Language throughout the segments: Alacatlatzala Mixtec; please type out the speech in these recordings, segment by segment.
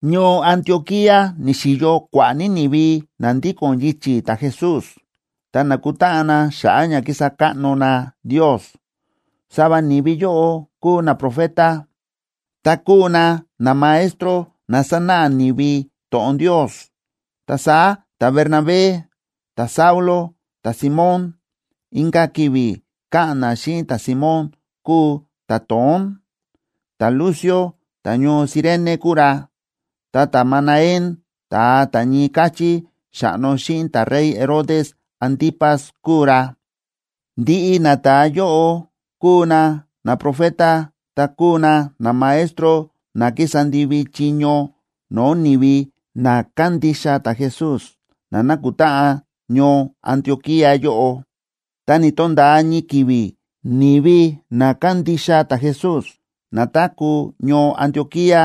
Ñoo Antioquía ni̱xi̱yo kua̱ꞌa̱ ní ni̱vi na ndíko̱n yichi̱ ta̱Jesús ta nákutáꞌan na xa̱ꞌa̱ ña kísa káꞌno na Ndios. Sava ni̱vi yóꞌo kúu naprofeta, ta kúu na namaestro na sánáꞌa ni̱vi to̱ꞌon Ndios. Ta saá ta̱Bernabé, ta̱Saulo, ta̱Simón (inka̱ ki̱vi̱ káꞌa̱n na xíꞌin ta̱Simón kúu ta̱To̱ón), ta̱Lucio ta̱ñoo Cirene kúu ra, ta ta̱Manaén (ta̱a ta̱ ñii káchí xa̱ꞌno xíꞌin ta̱rey Herodes Antipas kúu ra),a ndiꞌi nata̱a yóꞌo kúu na naprofeta ta kúu na namaestro na kísa ndivi chiño no̱o̱ ni̱vi na kándixa ta̱Jesús na nákutáꞌan ñoo Antioquía yóꞌo. Ta ni̱to̱nda̱a ñii ki̱vi̱ ni̱vi na kándixa ta̱Jesús na táku̱ ñoo Antioquía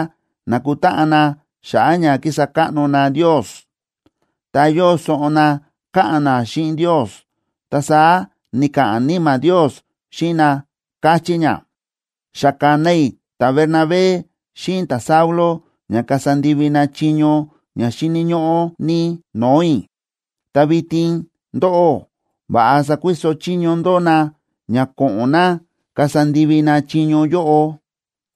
na̱kutáꞌan na xa̱ꞌa̱ ña kísa káꞌno na Ndios, ta yóo soꞌon na káꞌa̱n na xíꞌin Ndios, ta saá ni̱ka̱ꞌa̱n Níma̱ Ndios xíꞌin na, káchí ña: ―Xa ka̱na i̱ ta̱Bernabé xíꞌin ta̱Saulo ña kasa ndivi na chiño ña xíni̱ ñóꞌó ní no̱o̱ i̱. Ta vitin ndóꞌó, va̱ꞌa sakuiso chiño ndó na ña ko̱ꞌo̱n na kasa ndivi na chiño yóꞌo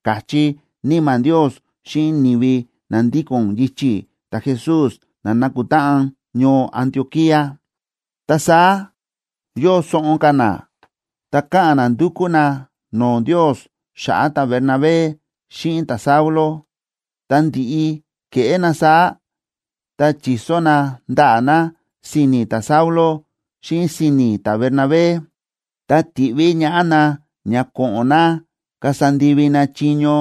―ka̱chí Níma̱ Ndios xíꞌin ni̱vi na ndíko̱n yichi̱ ta̱Jesús na na̱kutáꞌan ñoo Antioquía. Ta saá yóo soꞌon ka̱ na, ta káꞌa̱n na ndúkú na no̱o̱ Ndios xa̱ꞌa̱ ta̱Bernabé xíꞌin ta̱Saulo. Ta ndi̱ꞌi ke̱ꞌé na saá, ta chi̱so na ndaꞌa̱ na si̱ni̱ ta̱Saulo xíꞌin si̱ni̱ ta̱Bernabé, ta ti̱ꞌví ñaꞌá na ña ko̱ꞌo̱n na kasa ndivi na chiño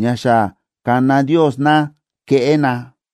ña xa ka̱na Ndios na keꞌé na.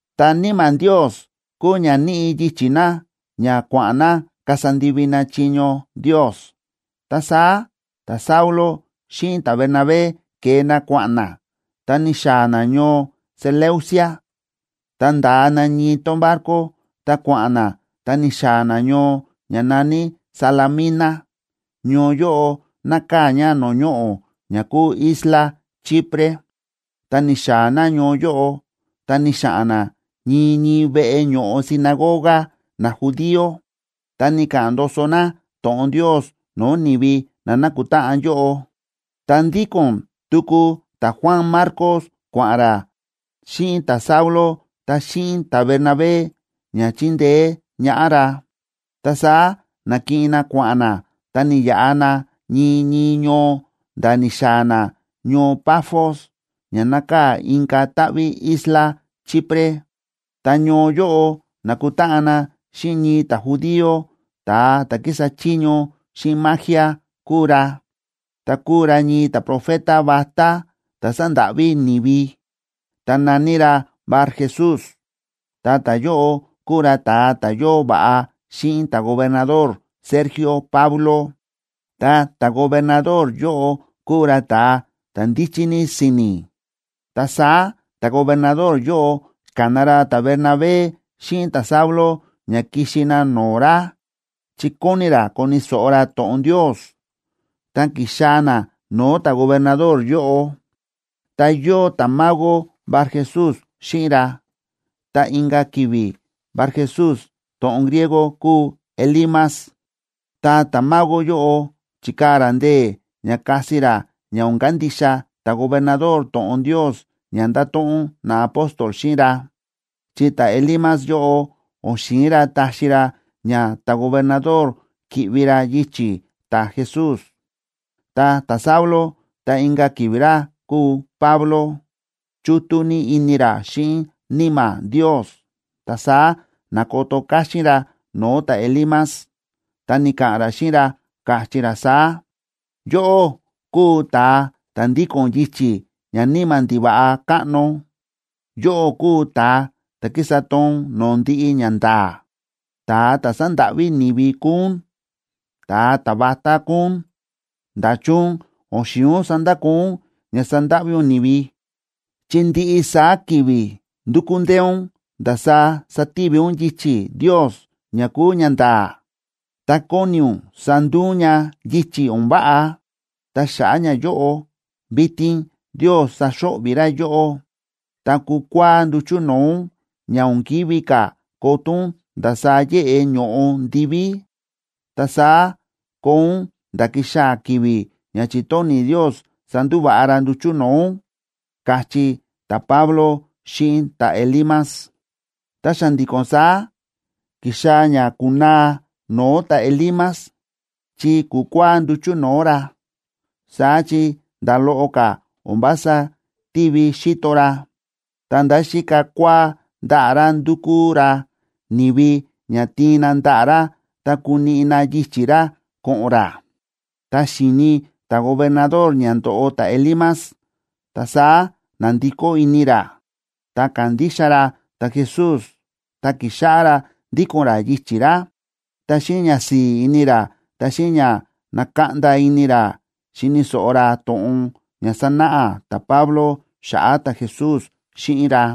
Ta Níma̱ Ndios kúu ña níꞌi yichi̱ na ña kua̱ꞌa̱n na kasa ndivi na chiño Ndios. Ta saá ta̱Saulo xíꞌin ta̱Bernabé ke̱e na kua̱ꞌa̱n na ta ni̱xaa̱ na ñoo Seleucia, ta nda̱a na ñii tón barco, ta kua̱ꞌa̱n na ta ni̱xaa̱ na ñoo ña na̱ní Salamina. Ñoo yóꞌo nákaa̱ ña no̱o̱ ñoꞌo̱ ña kúu isla Chipre. Ta ni̱xaa̱ na ñoo yóꞌo, ta ni̱xa̱ꞌa̱n na ñii ñii veꞌe ño̱ꞌo sinagoga najudío, ta ni̱ka̱ꞌa̱n ndoso na to̱ꞌon Ndios no̱o̱ ni̱vi na na̱kutáꞌan yóꞌo. Ta ndíko̱n tuku ta̱Juan Marcos kua̱ꞌa̱n ra xíꞌin ta̱Saulo ta xíꞌin ta̱Bernabé ña chíndeé ñaꞌá ra. Ta saá na̱kiꞌin na kua̱ꞌa̱n na ta ni̱yaꞌa na ñii ñii ñoo nda̱ ni̱xaa̱ na ñoo Pafos, ña nákaa̱ inka̱ táꞌví isla Chipre. Ta ñoo yóꞌo na̱kutáꞌan na xíꞌin ñii ta̱judío, ta̱a ta̱ kísa chiño xíꞌin magia kúu ra, ta kúu ra ñii ta̱profeta vatá ta̱ sándáꞌví ni̱vi, ta na̱ní ra Barjesús. Ta ta̱yóꞌo kúu ra ta̱a ta̱ yóo va̱ꞌa xíꞌin ta̱gobernador Sergio Paulo, ta ta̱gobernador yóꞌo kúu ra ta̱a ta̱ ndíchí ní si̱ni̱. Ta saá ta̱gobernador yóꞌo ka̱na ra ta̱Bernabé xíꞌin ta̱Saulo ña kixi na no̱o̱ ra chi kóni ra koni̱ so̱ꞌo ra to̱ꞌon Ndios. Tá ki̱xaa̱ na no̱o̱ ta̱gobernador yóꞌo, ta yóo ta̱mago Barjesús xíꞌin ra. (Ta inka̱ ki̱vi̱ Barjesús to̱ꞌon griego kúu Elimas.) Ta ta̱mago yóꞌo chíkaa̱ ra ndee̱ ña kasi ra ña o̱n kandixa ta̱gobernador to̱ꞌon Ndios ña ndato̱ꞌon naapóstol xíꞌin ra, chi ta̱Elimas yóꞌo o̱n xi̱in ra taxi ra ña ta̱gobernador ki̱ꞌvi ra yichi̱ ta̱Jesús. Ta ta̱Saulo (ta inka̱ ki̱vi̱ ra kúu Pablo), chútú ní ini ra xíꞌin Níma̱ Ndios, ta saá na̱koto káxín ra no̱o̱ ta̱Elimas ta ni̱ka̱ꞌa̱n ra xíꞌin ra, káchí ra saá: ―¡Yóꞌó kúu ta̱a ta̱ ndíko̱n yichi̱ ñaníma̱ ndiva̱ꞌa káꞌno! Yóꞌó kúu ta̱a ta̱ kísa toon no̱o̱ ndiꞌi ñanda̱a̱. Ta̱a ta̱ sándáꞌví ni̱vi kúu ún, ta̱a ta̱vatá kúu ún. ¿Nda̱chun o̱n xi̱in ún sandakoo ún ña sándáꞌví ún ni̱vi?, chi ndiꞌi saá ki̱vi̱ ndúkú ndee ún ndasaá sativi ún yichi̱ Ndios ña kúu ñanda̱a̱, ta kóni ún sanduu ún ña yichi̱ o̱n váꞌa. Ta xa̱ꞌa̱ ñayóꞌo, vitin Ndios saxo̱ꞌvi̱ ra yóꞌó, ta kukua̱á nduchu̱ no̱o̱ ún ña o̱n kívi ka̱ koto ún ndasaá yéꞌe ño̱ꞌo ndiví, ta saá koo ún nda̱ kixaa̱ ki̱vi̱ ña chi̱tóni̱ Ndios sandúva̱ꞌa ra nduchu̱ no̱o̱ ún ―káchí ta̱Pablo xíꞌin ta̱Elimas. Ta xa̱ndi̱ko̱n saá ki̱xaa̱ ña ku̱naa no̱o̱ ta̱Elimas, chi ku̱kua̱á nduchu̱ no̱o̱ ra. Saá chi nda̱ loꞌo ka̱ o̱n vása tívi xíto ra, ta̱nda̱ xíka kua̱á ndaꞌa̱ ra, ndúkú ra ni̱vi ña tiin na ndaꞌa̱ ra ta kuniꞌi na yichi̱ ra ko̱ꞌo̱n ra. Tá xi̱ni ta̱gobernador ña ndo̱ꞌo ta̱Elimas, ta saá na̱ndikó ini ra, ta ka̱ndixa ra ta̱Jesús ta ki̱xáꞌá ra ndíko̱n ra yichi̱ ra. Ta xíꞌin ñasi̱i̱ ini ra ta xíꞌin ña na̱kaꞌnda ini ra, xíni̱ so̱ꞌo ra to̱ꞌon ña sa̱náꞌa ta̱Pablo xa̱ꞌa̱ ta̱Jesús xíꞌin ra.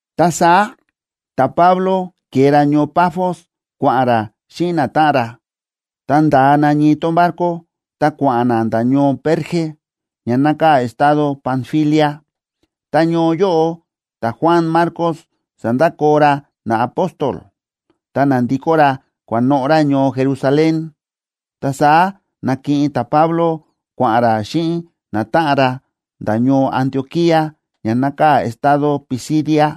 Ta saá ta̱Pablo ke̱e ra ñoo Pafos kua̱ꞌa̱n ra xíꞌin natáꞌan ra, ta nda̱a na ñii tón barco, ta kua̱ꞌa̱n na nda̱ ñoo Perge, ña nákaa̱ estado Panfilia. Ta ñoo yóꞌo ta̱Juan Marcos sa̱ndakoo ra naapóstol, ta na̱ndikó ra kua̱noꞌo̱ ra ñoo Jerusalén. Ta saá na̱kiꞌin ta̱Pablo kua̱ꞌa̱n ra xíꞌin natáꞌan ra nda̱ ñoo Antioquía ña nákaa̱ estado Pisidia.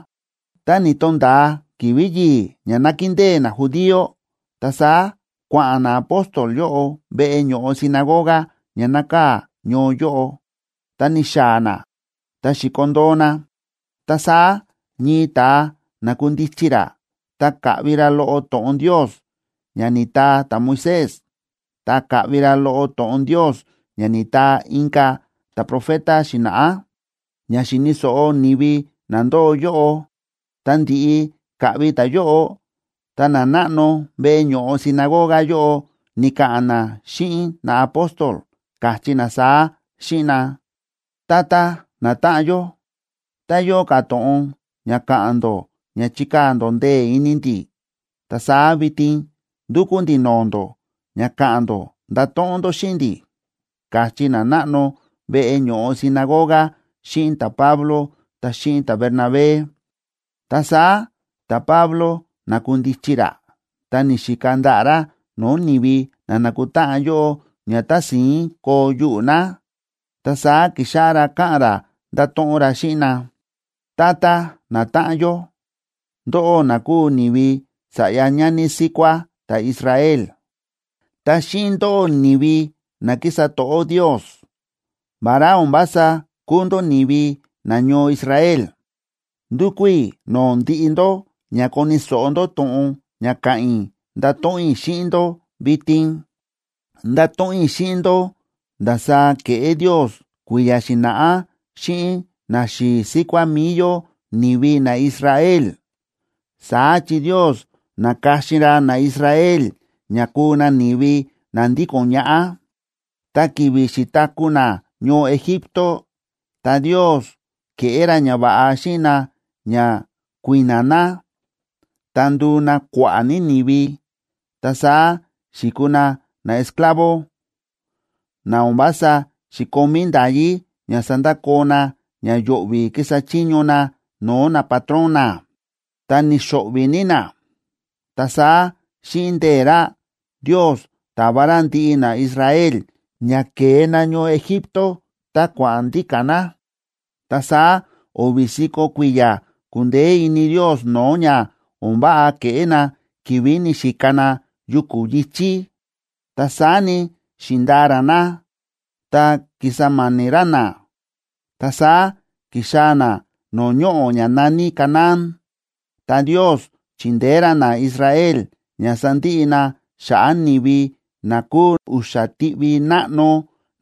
Tá ni̱to̱nda̱a ki̱vi̱ yi̱i̱ ña nákindée najudío, ta saá kua̱ꞌa̱n naapóstol yóꞌo veꞌe ño̱ꞌo sinagoga ña nákaa̱ ñoo yóꞌo, ta ni̱xaa̱ na ta xi̱kondoo na. Ta saá ñii ta̱a na̱kundichi ra ta ka̱ꞌvi ra loꞌo to̱ꞌon Ndios ña ni̱taa ta̱Moisés, ta ka̱ꞌvi ra loꞌo to̱ꞌon Ndios ña ni̱taa inka̱ ta̱profeta xi̱na̱ꞌá ña xi̱ni̱ so̱ꞌo ni̱vi na ndóo yóꞌo. Ta ndi̱ꞌi ka̱ꞌvi ta̱yóꞌo, ta nanáꞌno veꞌe ño̱ꞌo sinagoga yóꞌo ni̱ka̱ꞌa̱n na xíꞌin naapóstol, káchí na saá xíꞌin na: ―Tata natáꞌan yó, tá yóo ka̱ to̱ꞌon ña ka̱ꞌa̱n ndó ña chikaa̱ ndó ndee̱ ini ndi̱, ta saá vitin ndúkú ndi̱ no̱o̱ ndó ña ka̱ꞌa̱n ndó ndato̱ꞌon ndó xíꞌin ndi̱ ―ka̱chí nanáꞌno veꞌe ño̱ꞌo sinagoga xíꞌin ta̱Pablo ta xíꞌin ta̱Bernabé. Ta saá ta̱Pablo na̱kundichi ra ta ni̱xika ndaꞌa̱ ra no̱o̱ ni̱vi na na̱kutáꞌan yóꞌo ña tási̱ín koo yuꞌu̱ na. Ta saá ki̱xáꞌá ra ka̱ꞌa̱n ra, nda̱to̱ꞌon ra xíꞌin na: ―Tata natáꞌan yó, ndóꞌó na kúu ni̱vi sa̱ꞌya ñani síkuá ta̱Israel, ta xíꞌin ndóꞌó, ni̱vi na kísa to̱ꞌó Ndios, vará o̱n vása kúu ndó ni̱vi nañoo Israel, ndúkú i̱ no̱o̱ ndiꞌi ndó ña koni̱ so̱ꞌo ndó to̱ꞌon ña ka̱ꞌa̱n i̱ ndato̱ꞌon i̱ xíꞌin ndó vitin. Ndato̱ꞌon i̱ xíꞌin ndó ndasaá ke̱ꞌé Ndios kui̱ya̱ xi̱na̱ꞌá xíꞌin naxi̱i̱ síkuá mi̱i yó ni̱vi naIsrael. Saá chi Ndios na̱ka̱xin ra naIsrael ña kuu na ni̱vi na ndíko̱n ñaꞌá. Ta ki̱vi̱ xi̱taku̱ na ñoo Egipto, ta Ndios ke̱ꞌé ra ñava̱ꞌa xíꞌin na ña kui̱na̱ na, ta ndu̱u na kua̱ꞌa̱ ní ni̱vi. Ta saá xi̱kuu na naesclavo, na o̱n vása xi̱komí nda̱yí ña sandakoo na ña yo̱ꞌvi̱ ki̱sa chiño na no̱o̱ napatrón na, ta ni̱xo̱ꞌvi̱ ní na. Ta saá xíꞌin ndee̱ ra, Ndios ta̱va ra ndiꞌi naIsrael ña ke̱e na ñoo Egipto, ta kua̱ꞌa̱n ndíka̱ na. Ta saá o̱vi̱ si̱ko̱ kui̱ya̱ ku̱ndeé ini Ndios no̱o̱ ña o̱n váꞌa ke̱ꞌé na ki̱vi̱ ni̱xika na yuku̱ yi̱chí. Ta saá ni, xi̱ndaa ra na ta ki̱sa ma̱ni̱ ra na. Ta saá ki̱xaa̱ na no̱o̱ ñoꞌo̱ ña na̱ní Canaán, ta Ndios chi̱ndeé ra naIsrael ña sa̱ndiꞌi na xa̱ꞌa̱ ni̱vi na kúu u̱xa̱ tiꞌvi náꞌno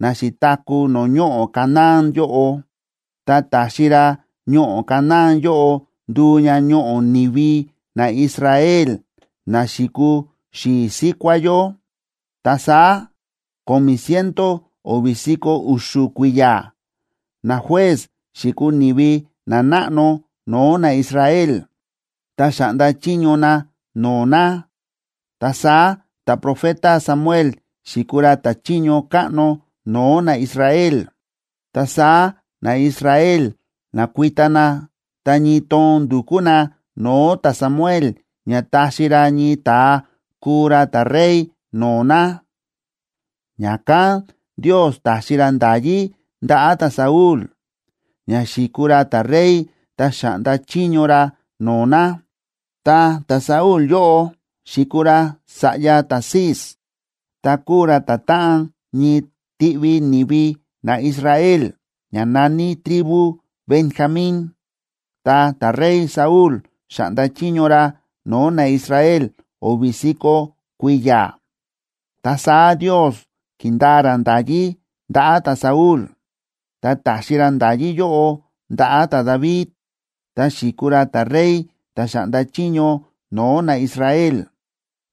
na xi̱taku̱ no̱o̱ ñoꞌo̱ Canaán yóꞌo, ta ta̱xi ra ñoꞌo̱ Canaán yóꞌo ndu̱u ña ñoꞌo̱ ni̱vi naIsrael na xi̱kuu xi̱i̱ síkuá yó. Ta saá, ko̱mi̱ ciento o̱vi̱ si̱ko̱ u̱xu̱ kui̱ya̱, najuez xi̱kuu ni̱vi nanáꞌno no̱o̱ naIsrael, ta xa̱ꞌnda chiño na no̱o̱ na. Ta saá ta̱profeta Samuel xi̱kuu ra ta̱chiño káꞌno no̱o̱ naIsrael. Ta saá naIsrael na̱kuita na, ta ñii toon ndu̱kú na no̱o̱ ta̱Samuel ña taxi ra ñii ta̱a kuu ra ta̱rey no̱o̱ na. Ña̱kán Ndios ta̱xi ra nda̱yí ndaꞌa̱ ta̱Saúl ña xi̱kuu ra ta̱rey ta xa̱ꞌnda chiño ra no̱o̱ na. Ta ta̱Saúl yóꞌo xi̱kuu ra sa̱ꞌya ta̱Cis, ta kúu ra ta̱táꞌan ñii tiꞌvi ni̱vi naIsrael, ña na̱ní tribu Benjamín. Ta ta̱rey Saúl xa̱ꞌnda chiño ra no̱o̱ naIsrael o̱vi̱ si̱ko̱ kui̱ya̱. Ta saá Ndios ki̱ndaa ra nda̱yí ndaꞌa̱ ta̱Saúl, ta ta̱xi ra nda̱yí yóꞌo ndaꞌa̱ ta̱David, ta xi̱kuu ra ta̱rey ta̱ xa̱ꞌnda chiño no̱o̱ naIsrael.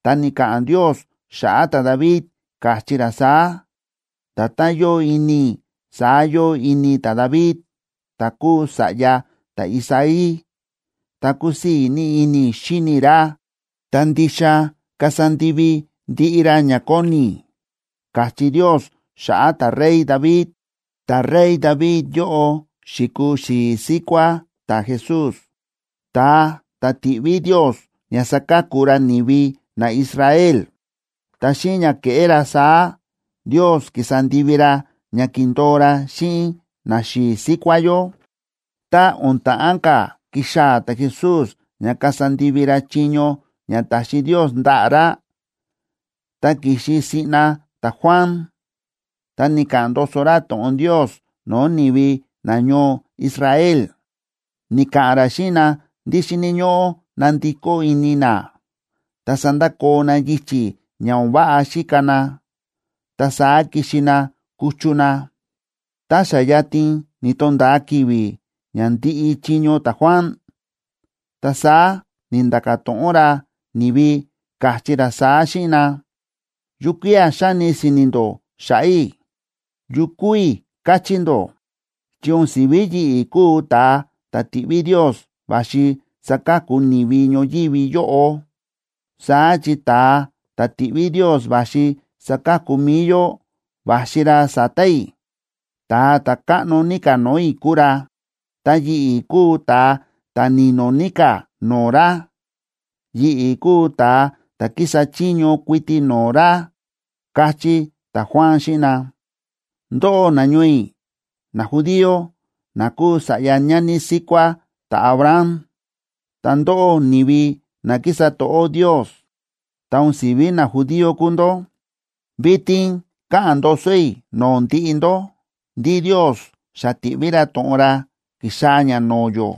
Ta ni̱ka̱ꞌa̱n Ndios xa̱ꞌa̱ ta̱David, káchí ra saá: “Nda̱tán yóo ini i̱, saá yóo ini ta̱David, ta̱ kúu sa̱ꞌya ta̱Isaí, ta kúsii̱ ní ini i̱ xíni i̱ ra, ta ndixa kasa ndivi ndiꞌi ra ña kóni i̱”, káchí Ndios xa̱ꞌa̱ ta̱rey David. Ta̱rey David yóꞌo xi̱kuu xi̱i̱ síkuá ta̱Jesús, ta̱a ta̱ ti̱ꞌví Ndios ña saka̱ku ra ni̱vi naIsrael. Ta xíꞌin ña ke̱ꞌé ra saá, Ndios ki̱sa ndivi ra ña ki̱ndo̱o ra xíꞌin naxi̱i̱ síkuá yó. Tá o̱n ta̱ꞌán ka̱ kixaa̱ ta̱Jesús ña kasa ndivi ra chiño ña ta̱xi Ndios ndaꞌa̱ ra, ta ki̱xi siꞌna ta̱Juan, ta ni̱ka̱ꞌa̱n ndoso ra to̱ꞌon Ndios no̱o̱ ni̱vi nañoo Israel. Ni̱ka̱ꞌa̱n ra xíꞌin na ndí xíni̱ ñóꞌó nandikó ini na, ta sandakoo na yichi̱ ña o̱n váꞌa xíka na, ta saá kixi na kuchu na. Tá xa yatin ni̱to̱nda̱a ki̱vi̱ ña ndi̱ꞌi chiño ta̱Juan, ta saá ni̱nda̱ka̱ to̱ꞌon ra ni̱vi, káchí ra saá xíꞌin na: “¿Yukía̱ xáni si̱ni̱ ndó xa̱ꞌa̱ i̱? ¿Yu kúu i̱, káchí ndó? Chi o̱n si̱ví yi̱ꞌi̱ kúu ta̱a ta̱ ti̱ꞌví Ndios va̱xi saka̱ku ni̱vi ñoyívi yóꞌo. Saá chi ta̱a ta̱ ti̱ꞌví Ndios va̱xi saka̱ku mi̱i yó va̱xi ra sa̱ta̱ i̱. Ta̱a ta̱ káꞌno ní ka̱ no̱o̱ i̱ kúu ra, ta yi̱ꞌi̱ kúu ta̱a ta̱ ni̱no̱ ní ka̱ no̱o̱ ra. Yi̱ꞌi̱ kúu ta̱a ta̱ kísa chiño kuiti no̱o̱ ra”, káchí ta̱Juan xíꞌin na. ’Ndóꞌó, nañoo i̱, najudío na kúu sa̱ꞌya ñani síkuá ta̱Abraham, ta ndóꞌó ni̱vi na kísa to̱ꞌó Ndios, ta o̱n si̱ví najudío kúu ndó, vitin káꞌa̱n ndoso i̱ no̱o̱ ndiꞌi ndó ndí Ndios xa ti̱ꞌví ra to̱ꞌon ra ki̱xaa̱ ña no̱o̱ yó,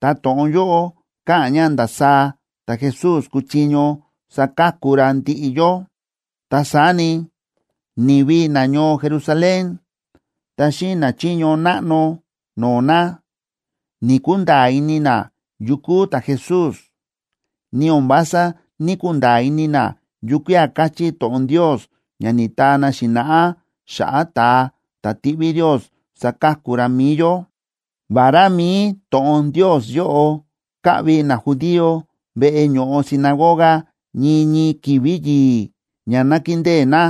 ta to̱ꞌon yóꞌo káꞌa̱n ña ndasaá ta̱Jesús kuchiño saka̱ku ra ndiꞌi yó. Ta saá ni, ni̱vi nañoo Jerusalén ta xíꞌin nachiño náꞌno no̱o̱ na, ni̱‑kunda̱a̱ ini na yu kúu ta̱Jesús, ni o̱n vása ní‑kunda̱a̱ ini na yukía̱ káchí to̱ꞌon Ndios ña ni̱taa na xi̱na̱ꞌá xa̱ꞌa̱ ta̱a ta̱ tiꞌví Ndios saka̱ku ra mi̱i yó. Vará mi̱i to̱ꞌon Ndios yóꞌo káꞌvi najudío veꞌe ño̱ꞌo sinagoga ñii ñii ki̱vi̱ yi̱i̱ ña nákindée na,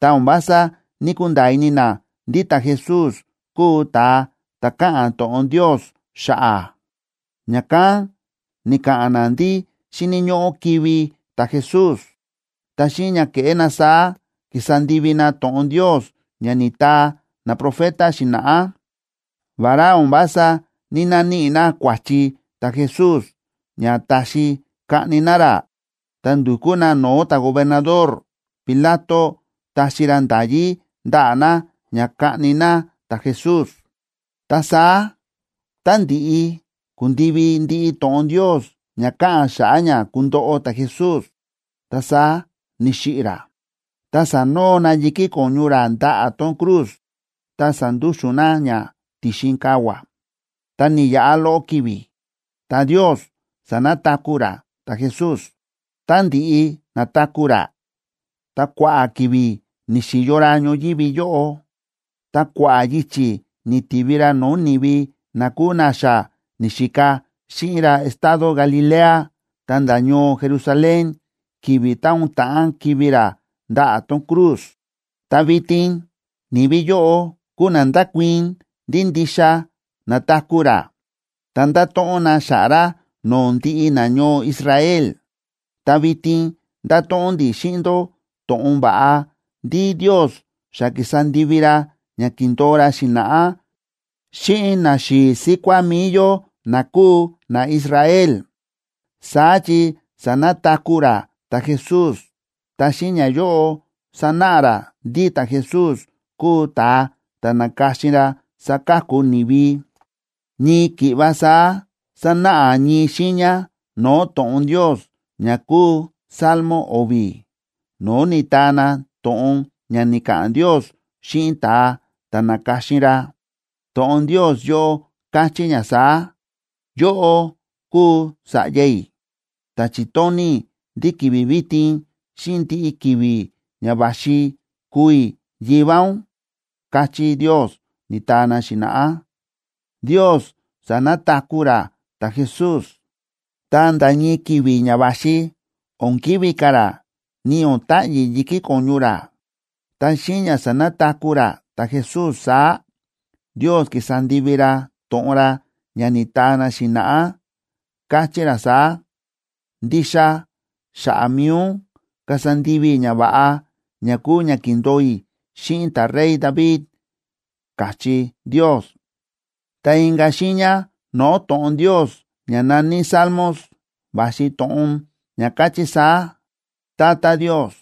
ta o̱n vása ní‑kunda̱a̱ ini na ndí ta̱Jesús kúu ta̱a ta̱ káꞌa̱n to̱ꞌon Ndios xa̱ꞌa̱. Ña̱kán ni̱ka̱ꞌa̱n na ndí xíni̱ ñóꞌó kivi̱ ta̱Jesús. Ta xíꞌin ña ke̱ꞌé na saá, ki̱sa ndivi na to̱ꞌon Ndios ña ni̱taa naprofeta xi̱na̱ꞌá. Vará o̱n vása ní‑naníꞌi na kua̱chi ta̱Jesús ña taxi kaꞌni na ra, ta ndu̱kú na no̱o̱ ta̱gobernador Pilato taxi ra nda̱yí ndaꞌa̱ na ña kaꞌni na ta̱Jesús. Ta saá, tá ndi̱ꞌi ku̱ndivi ndiꞌi to̱ꞌon Ndios ña káꞌa̱n xa̱ꞌa̱ ña kundoꞌo ta̱Jesús, ta saá ni̱xiꞌi̱ ra, ta sa̱noo na yi̱kí ko̱ñu ra ndaꞌa̱ tón cruz ta sa̱ndúxu̱n na ña ti̱xin kavua̱. Tá ni̱yaꞌa loꞌo ki̱vi̱, ta Ndios sa̱nataku̱ ra ta̱Jesús. Tá ndi̱ꞌi na̱taku̱ ra, ta kua̱ꞌa̱ ki̱vi̱ ni̱xi̱yo ra ñoyívi yóꞌo, ta kua̱ꞌa̱ yichi̱ ni̱tivi ra no̱o̱ ni̱vi na kúu na xa ni̱xika xíꞌin ra estado Galilea ta̱nda̱ ñoo Jerusalén ki̱vi̱ tá o̱n ta̱ꞌán kivi̱ ra ndaꞌa̱ tón cruz. Ta vitin ni̱vi yóꞌo kúu na ndákuii̱n ndí ndixa na̱taku̱ ra, ta ndáto̱ꞌon na xa̱ꞌa̱ ra no̱o̱ ndiꞌi nañoo Israel. ’Ta vitin ndáto̱ꞌon ndi̱ xíꞌin ndó to̱ꞌon va̱ꞌa ndí Ndios xa ki̱sa ndivi ra ña ki̱ndo̱o ra xi̱na̱ꞌá xíꞌin naxi̱i̱ síkuá mi̱i yó na kúu naIsrael. Saá chi sa̱nataku̱ ra ta̱Jesús, ta xíꞌin ñayóꞌo sánáꞌa ra ndí ta̱Jesús kúu ta̱a ta̱ na̱ka̱xin ra saka̱ku ni̱vi. Ñii ki̱ꞌva saá sánáꞌa ñii xiiña no̱o̱ to̱ꞌon Ndios ña kúu Salmo o̱vi̱, no̱o̱ ni̱taa na to̱ꞌon ña ni̱ka̱ꞌa̱n Ndios xíꞌin ta̱a ta̱ na̱ka̱xin ra. To̱ꞌon Ndios yóꞌo káchí ña saá: “Yóꞌó kúu Sa̱ꞌya i̱, ta chi̱tóni̱ i̱ ndí ki̱vi̱ vitin xíꞌin ndiꞌi ki̱vi̱ ña va̱xi kúu i̱ Yivá ún”, káchí Ndios, ni̱taa na xi̱na̱ꞌá. Ndios sa̱nataku̱ ra ta̱Jesús, ta nda̱ ñii ki̱vi̱ ña va̱xi o̱n kivi̱ ka̱ ra ni o̱n ta̱ꞌyi̱ yi̱kí ko̱ñu ra. Ta xíꞌin ña sa̱nataku̱ ra ta̱Jesús saá, Ndios ki̱sa ndivi ra to̱ꞌon ra ña ni̱taa na xi̱na̱ꞌá, káchí ra saá: “Ndixa xa̱ꞌa̱ mi̱i ndó kasa ndivi i̱ ñava̱ꞌa ña kúu ña ki̱ndo̱o i̱ xíꞌin ta̱rey David”, káchí Ndios. Ta inka̱ xiiña no̱o̱ to̱ꞌon Ndios ña na̱ní Salmos, va̱xi to̱ꞌon ña káchí saá: “Tata Ndios,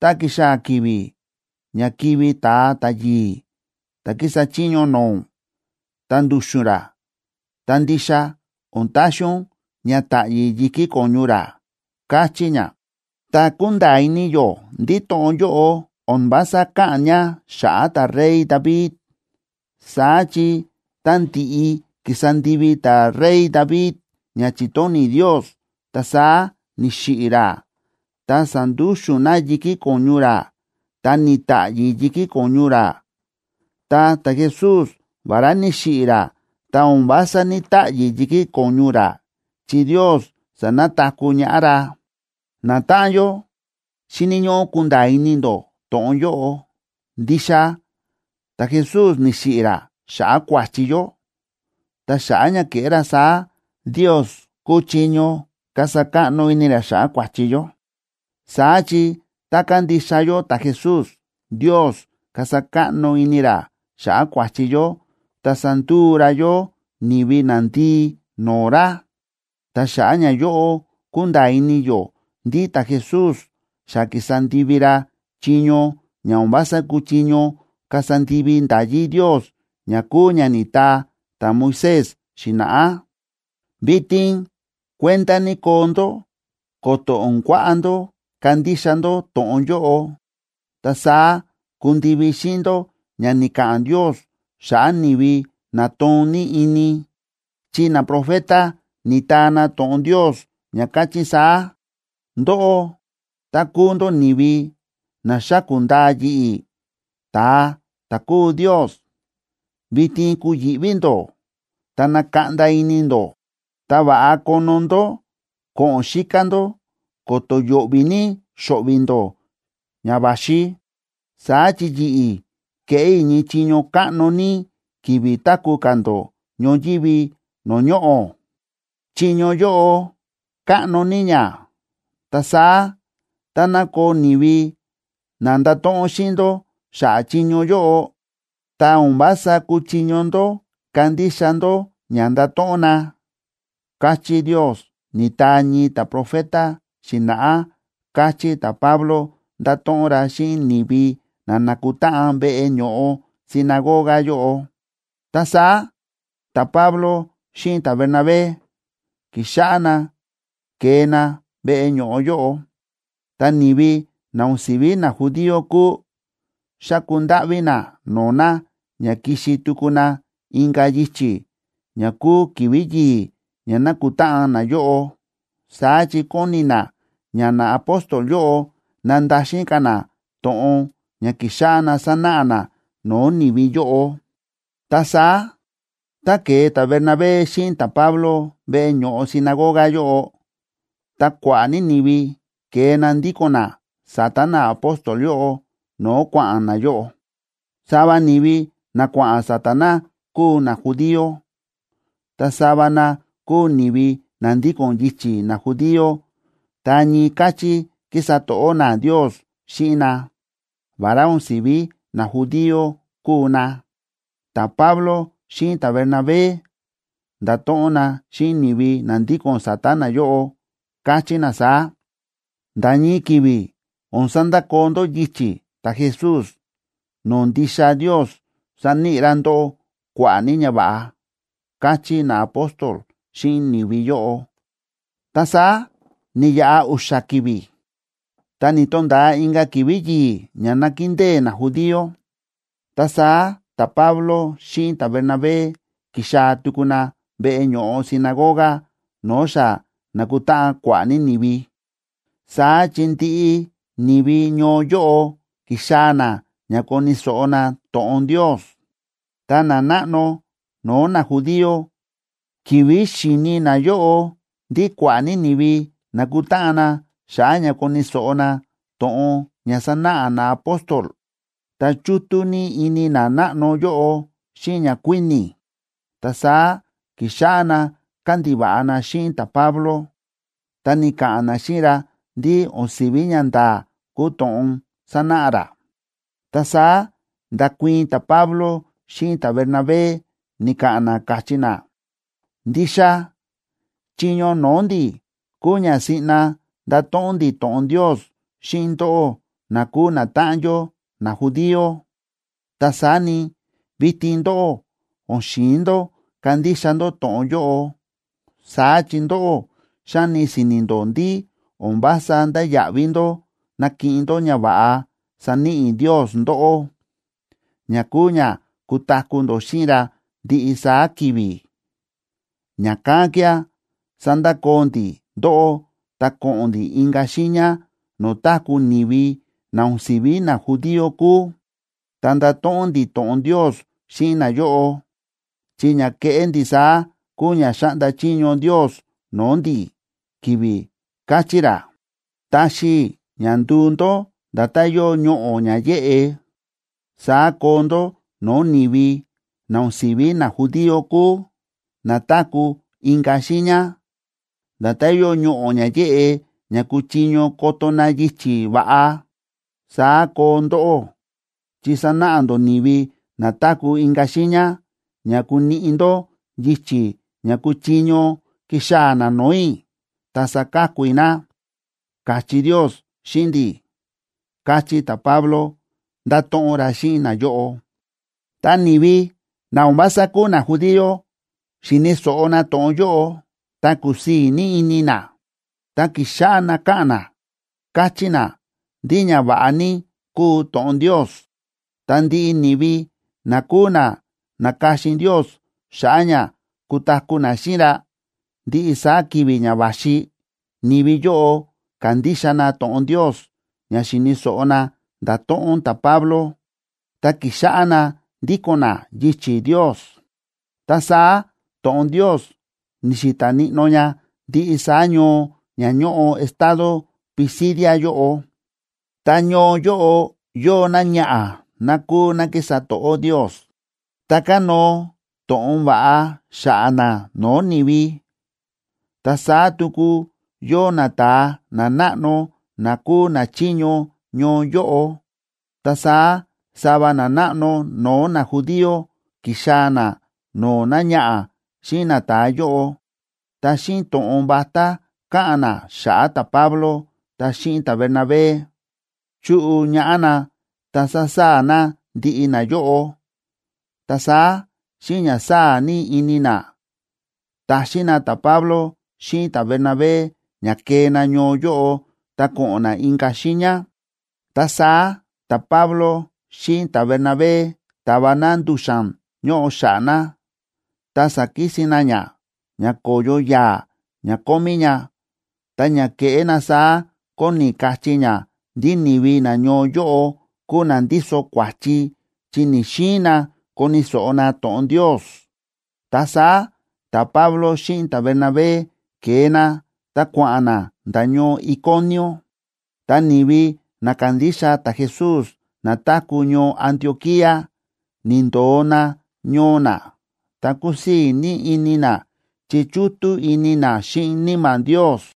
tá kixaa̱ ki̱vi̱ ña kivi̱ ta̱a ta̱yi̱i̱ ta̱ kísa chiño no̱o̱ ún, ta ndu̱xu̱n ra, ta ndixa o̱n taxi ún ña ta̱ꞌyi̱ yi̱kí ko̱ñu ra”, káchí ña. Ta kúnda̱a̱ ini yó ndí to̱ꞌon yóꞌo o̱n vása káꞌa̱n ña xa̱ꞌa̱ ta̱rey David. Saá chi tá ndi̱ꞌi ki̱sa ndivi ta̱rey David ña chi̱tóni̱ Ndios, ta saá ni̱xiꞌi̱ ra, ta sa̱ndúxu̱n na yi̱kí ko̱ñu ra, ta ni̱ta̱ꞌyi̱ yi̱kí ko̱ñu ra. Ta ta̱Jesús, vará ni̱xiꞌi̱ ra, ta o̱n vása ní‑taꞌyi̱ yi̱kí ko̱ñu ra, chi Ndios sa̱nataku̱ ñaꞌá ra. Natáꞌan yó, xíni̱ ñóꞌó kunda̱a̱ ini ndó to̱ꞌon yóꞌo: Ndixa ta̱Jesús ni̱xiꞌi̱ ra xa̱ꞌa̱ kua̱chi yó, ta xa̱ꞌa̱ ña ke̱ꞌé ra saá, Ndios kúchiño kasa káꞌno ini ra xa̱ꞌa̱ kua̱chi yó. Saá chi tá kandixa yó ta̱Jesús, Ndios kasa káꞌno ini ra xa̱ꞌa̱ kua̱chi yó ta sanduu ra yó ni̱vi nandii no̱o̱ ra. Ta xa̱ꞌa̱ ñayóꞌo kúnda̱a̱ ini yó ndí ta̱Jesús xa ki̱sa ndivi ra chiño ña o̱n vása kúchiño kasa ndivi nda̱yí Ndios ña kúu ña ni̱taa ta̱Moisés xi̱na̱ꞌá. Vitin kuenda ní koo ndó ko̱to̱ o̱n kuaꞌa ndó kandixa ndó to̱ꞌon yóꞌo, ta saá kundivi xíꞌin ndó ña ni̱ka̱ꞌa̱n Ndios xa̱ꞌa̱ ni̱vi na toon ní ini, chi naprofeta ni̱taa na to̱ꞌon Ndios ña káchí saá: Ndóꞌó, tá kúu ndó ni̱vi na xáku̱ ndaa yi̱ꞌi̱, ta̱a ta̱ kúu Ndios, vitin kuyi̱ꞌví ndó ta nakaꞌnda ini ndó. Ta va̱ꞌa kono ndó ko̱ꞌo̱n xíká ndó ko̱to̱ yo̱ꞌvi̱ ní xo̱ꞌvi̱ ndó ña va̱xi. Saá chi yi̱ꞌi̱ keꞌé i̱ ñii chiño káꞌno ní ki̱vi̱ táku̱ ka̱ ndó ñoyívi no̱o̱ ñoꞌo̱. Chiño yóꞌo káꞌno ní ña, ta saá, táná koo ni̱vi na ndato̱ꞌon xíꞌin ndó xa̱ꞌa̱ chiño yóꞌo, ta o̱n vása kuchiño ndó kandixa ndó ña ndato̱ꞌon na, káchí Ndios, ni̱taa ñii ta̱profeta xi̱na̱ꞌá ―káchí ta̱Pablo, nda̱to̱ꞌon ra xíꞌin ni̱vi na na̱kutáꞌan veꞌe ño̱ꞌo sinagoga yóꞌo. Ta saá ta̱Pablo xíꞌin ta̱Bernabé ki̱xáꞌá na kée na veꞌe ño̱ꞌo yóꞌo. Ta ni̱vi na o̱n si̱ví najudío kúu, xa̱ku ndáꞌví na no̱o̱ na ña kixi tuku na inka̱ yichi̱ ña kúu ki̱vi̱ yi̱i̱ ña nákutáꞌan nayóꞌo. Saá chi kóni na ña naapóstol yóꞌo nandaxin ka̱ na to̱ꞌon ña ki̱xáꞌá na sánáꞌa na no̱o̱ ni̱vi yóꞌo. Ta saá tá ke̱e ta̱Bernabé xíꞌin ta̱Pablo veꞌe ño̱ꞌo sinagoga yóꞌo, ta kua̱ꞌa̱ ní ni̱vi ke̱e na ndíko̱n na sa̱ta̱ naapóstol yóꞌo no̱o̱ kua̱ꞌa̱n nayóꞌo. Sava ni̱vi na kua̱ꞌa̱n sa̱ta̱ na kúu najudío, ta sava na kúu ni̱vi na ndíko̱n yichi̱ najudío ta ñii káchí kísa to̱ꞌó na Ndios xíꞌin na, vará o̱n si̱ví najudío kúu na. Ta̱Pablo xíꞌin ta̱Bernabé nda̱to̱ꞌon na xíꞌin ni̱vi na ndíko̱n sa̱ta̱ na yóꞌo, káchí na saá: ―Nda̱ ñii ki̱vi̱ o̱n sandakoo ndó yichi̱ ta̱Jesús no̱o̱ ndixa Ndios sáníꞌi ra ndóꞌó kua̱ꞌa̱ ní ñava̱ꞌa ―káchí naapóstol xíꞌin ni̱vi yóꞌo. Ta saá ni̱yaꞌa u̱xa̱ ki̱vi̱, ta ni̱to̱nda̱a inka̱ ki̱vi̱ yi̱i̱ ña nákindée najudío. Ta saá ta̱Pablo xíꞌin ta̱Bernabé ki̱xaa̱ tuku na veꞌe ño̱ꞌo sinagoga no̱o̱ xa na̱kutáꞌan kua̱ꞌa̱ ní ni̱vi. Saá chi ndiꞌi ni̱vi ñoo yóꞌo ki̱xaa̱ na ña koni̱ so̱ꞌo na to̱ꞌon Ndios. Ta nanáꞌno no̱o̱ najudío, ki̱vi̱ xi̱ni nayóꞌo ndí kua̱ꞌa̱ ní ni̱vi na̱kutáꞌan na xa̱ꞌa̱ ña koni̱ so̱ꞌo na to̱ꞌon ña sanáꞌa naapóstol, ta chútú ní ini nanáꞌno yóꞌo xíꞌin ñakuíni̱. Ta saá ki̱xáꞌá na kándiva̱ꞌa na xíꞌin ta̱Pablo, ta ni̱ka̱ꞌa̱n na xíꞌin ra ndí o̱n si̱ví ñanda̱a̱ kúu to̱ꞌon sánáꞌa ra. Ta saá nda̱kuii̱n ta̱Pablo xíꞌin ta̱Bernabé, ni̱ka̱ꞌa̱n na, káchí na: ―Ndixa chiño no̱o̱ ndi̱ kúu ña siꞌna ndato̱ꞌon ndi̱ to̱ꞌon Ndios xíꞌin ndóꞌó na kúu natáꞌan yó najudío. Ta saá ni, vitin ndóꞌó o̱n xi̱in ndó kandixa ndó to̱ꞌon yóꞌo. Saá chi ndóꞌó xáni si̱ni̱ ndó ndí o̱n vása ndáya̱ꞌví ndó nakiꞌin ndó ñava̱ꞌa saníꞌi Ndios ndóꞌó, ña kúu ña kutaku̱ ndó xíꞌin ra ndiꞌi saá ki̱vi̱. Ña̱kán kía̱ sandakoo ndi̱ ndóꞌó ta ko̱ꞌo̱n ndi̱ inka̱ xiiña no̱o̱ táku̱ ni̱vi na o̱n si̱ví najudío kúu, ta ndato̱ꞌon ndi̱ to̱ꞌon Ndios xíꞌin nayóꞌo. Chi ña keꞌé ndi̱ saá kúu ña xa̱ꞌnda chiño Ndios no̱o̱ ndi̱, ki̱vi̱ káchí ra: Taxi i̱ ña nduu ndó nda̱tán yóo ñoꞌo̱ ña yéꞌe, saá koo ndó no̱o̱ ni̱vi na o̱n si̱ví najudío kúu, na táku̱ inka̱ xiiña. Nda̱tán yóo ñoꞌo̱ ña yéꞌe, ña kuchiño koto na yichi̱ va̱ꞌa, saá koo ndóꞌó, chi sanáꞌa ndó ni̱vi na táku̱ inka̱ xiiña ña kuniꞌi ndó yichi̱ ña kuchiño kixaa̱ na no̱o̱ i̱, ta saka̱ku i̱ na, káchí Ndios xíꞌin ndi̱ ―káchí ta̱Pablo, ndáto̱ꞌon ra xíꞌin nayóꞌo. Tá ni̱vi na o̱n vása kúu najudío xi̱ni̱ so̱ꞌo na to̱ꞌon yóꞌo, ta kúsii̱ ní ini na, ta ki̱xáꞌá na káꞌa̱n na, káchí na ndí ñava̱ꞌa ní kúu to̱ꞌon Ndios. Ta ndiꞌi ni̱vi na kúu na na̱ka̱xin Ndios xa̱ꞌa̱ ña kutaku̱ na xíꞌin ra ndiꞌi saá ki̱vi̱ ña va̱xi, ni̱vi yóꞌo ka̱ndixa na to̱ꞌon Ndios ña xi̱ni̱ so̱ꞌo na nda̱to̱ꞌon ta̱Pablo, ta ki̱xáꞌá na ndíko̱n na yichi̱ Ndios. Ta saá to̱ꞌon Ndios ni̱xi̱ta̱ níꞌnó ña ndiꞌi saá ñoo ña ñóꞌo estado Pisidia yóꞌo. Ta ñoo yóꞌo yóo náñaꞌa̱ ná kúu ná kísa to̱ꞌó Ndios, ta kánóo to̱ꞌon va̱ꞌa xa̱ꞌa̱ ná no̱o̱ ni̱vi. Ta saá tuku yóo nata̱a nanáꞌno na kúu nachiño ñoo yóꞌo. Ta saá sava nanáꞌno no̱o̱ najudío ki̱xaa̱ na no̱o̱ náñaꞌa̱ xíꞌin nata̱a yóꞌo, ta xíꞌin to̱ꞌon vatá káꞌa̱n na xa̱ꞌa̱ ta̱Pablo ta xíꞌin ta̱Bernabé, chu̱ꞌu ñaꞌá na, ta sa̱saa̱ na ndiꞌi nayóꞌo. Ta saá xíꞌin ña sáa̱ ní ini na, ta̱xin na ta̱Pablo xíꞌin ta̱Bernabé ña kee na ñoo yóꞌo ta ko̱ꞌo̱n na inka̱ xiiña. Ta saá ta̱Pablo xíꞌin ta̱Bernabé ta̱va na ndu̱xa̱n ñóꞌo xa̱ꞌa̱ na, ta sa̱kisin na ña, ña ko̱yo yaa̱ ña kómí ña. Ta ña ke̱ꞌé na saá kóni kachí ña ndí ni̱vi nañoo yóꞌo kúu na ndíso kua̱chi chi ni̱‑xiin na koni̱ so̱ꞌo na to̱ꞌon Ndios. Ta saá ta̱Pablo xíꞌin ta̱Bernabé ke̱e na ta kua̱ꞌa̱n na nda̱ ñoo Iconio. Ta ni̱vi na kándixa ta̱Jesús na táku̱ ñoo Antioquía ni̱ndo̱o na ñoo na, ta kúsii̱ ní ini na, chi chútú ini na xíꞌin Níma̱ Ndios.